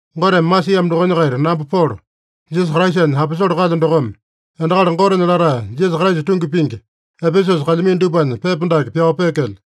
Goteme masiamo dokonya-kaita namba Polo, Jisasa Kraisanya aposole kalyo dokome, endakali Gotenya latae, Jisasa Kraisa tungi pingi, Epesusa kalyamino dupanya pepa dake pyao peekelyo.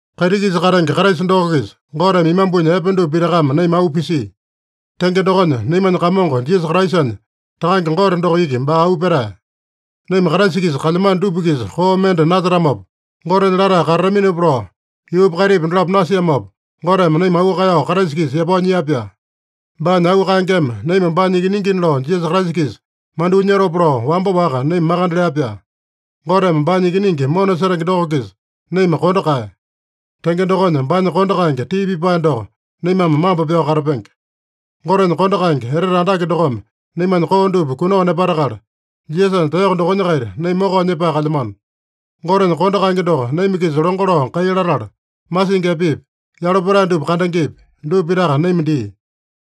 Kaiti-kisa katenge Kraisa doko-kisa Goteme imambunya epe dupa pitakame naima auu pisia. Tenge dokonya, naimanya Kamongo Jisasa Kraisanya Takange Gote doko iki baa auu petae. Naima Kraisa-kisa kalyamano dupa-kisa koo mende nasetamopa, Gotenya latae katataminopa lao, yuupa kaitipa dolapo nasiamopa, Goteme naima auu kaeyao Kraisa-kisa yapao nyia-pyaa. Baanya auu kaengeme naima baanya ikiningina lao Jisasa Kraisa-kisa mandyoo nyotopa lao wamba-waka naima makande lea-pyaa. Goteme baanya Ikiningi mona setenge doko-kisa naima kondo kaeya. Tenge dokonya, baanya kondo kaenge tii pipae doko naimame mambo pyao katapenge. Gotenya kondo kaenge etete andake dokome naimanya koo dupa kunao nepatakala, Jisasanya taeyoko dokonya-kaita naima mokao nyepae kalyamano. Gotenya kondo kaenge doko naima-kisa longo lao kai latala, masingi epepi, yalo petae dupa kandengepi, dupa pitaka naima dia.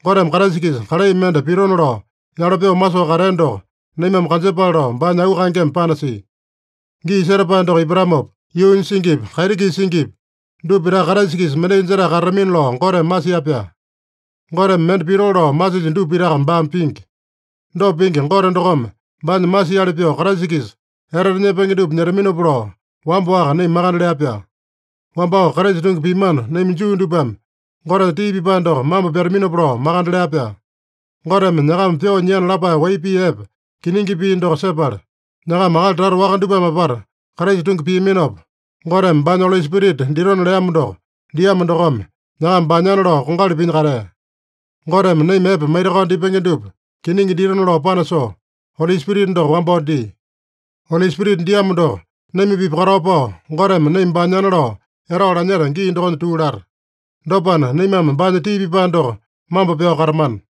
Goteme Kraisa-kisa kalai mende pitona lao yalo pyoo masoo katea doko naimame kanjepale lao baanya auu kaengeme panasia. Gii setapae doko ipatamopa, yuunya singipi, kaiti-kisa singipi, dupa pitaka Kraisa-kisa mendai jetae katatamina lao Goteme masia-pyaa. Goteme mende pitoo lao masilya dupa pitaka baame pingi. Dopa pingi Gote dokome baanya masiali pyoo Kraisa-kisa etete nyepenge dupa nyetaminopa lao wamba-waka naima makande lea-pyaa. Wambao Kraisa tungi piamano, naima Juu dupame Gotenya tii pipae doko mambo pyataminopa lao makande lea-pyaa. Goteme nyakama pyoo nyiana lapae wai pii epe, kiningi pii doko sepala, nyakama akali tata waka dupame apata Kraisa tungi piaminopa, Goteme baanya Oli Spirita ditona leamo doko diamo dokome, nyakama baanyana lao kongali pinya katea. Goteme naima epe maitakao dipenge dupa kiningi ditona lao panasoo, Oli Spirita doko wambao dia. Oli Spirita diamo doko naima-pipa katao pao, Goteme naima baanyana lao etao lanyeta gii dokonya tuu lata. Dopana, naimame baanya tii pipae doko mambo pyao katamana.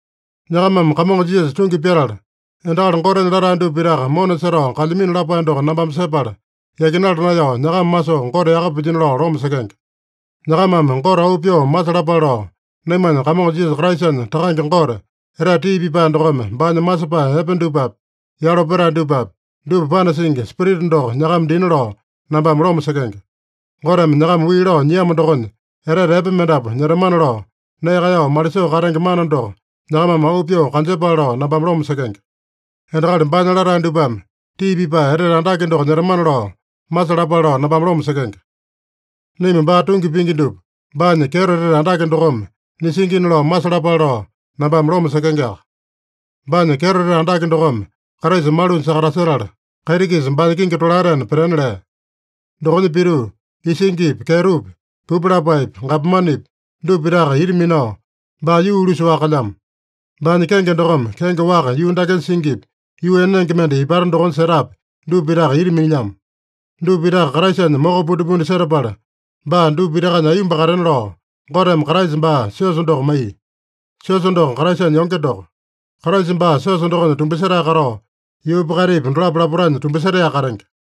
Nyakamame Kamongo Jisasa tungi pyatala, endakali Gotenya latae dupa pitaka mona setao kalyamino lapae doko nambame sepala, yakinala naeyao nyakama masoo Gote yaka pilyino lao loma sekenge. Nyakamame Gote auu pyoo masalapale lao, naimanya Kamongo Jisasa Kraisanya Takange Gote, etete tii pipae dokome baanya masepae epe dupapi, yalo petae dupapi, dupa panasingi Spirita doko nyakama dina lao nambame loma sekenge. Goteme nyakama wii lao nyiamo dokonya, etete epe mendapu nyetamana lao nee kaeyao malisoo katenge mana doko nyakamame auu pyoo kanjepale lao nambame loma sekenge. Endakali baanya latae dupame tii pipae etete andake doko nyetamana lao masalapale lao nambame loma sekenge. Naima baa tungi pingi dupa baanya kyeto etete andake dokome nisingina lao masalapale lao nambame loma sekengeaka. Baanya kyeto etete andake dokome Kraisa malunya sakatasetala, kaiti-kisa baanya kingi tolaetena petena lea. Dokonya pituu, isingipi, kyetopi, pupu lapaepi, gapomanepi, dupa pitaka ita minao, baa yuu-ulusa-waka kalyamo. Baanya kenge dokome kenge waka yuu dakenya singipi, yuu enenge mende ipata dokonya setapi, dupa pitaka ita minilyamo. Dupa pitaka Kraisanya moko pundipundi setapala, baa dupa pitakanya aiyomba katena lao, Goteme Kraisa baa siosa doko maiya. Siosa doko Kraisanya yonge doko. Kraisa baa siosa dokonya tumbasetae katao, yuupa kaitipa dolapo lapotanya tumbasetaeyaka katenge.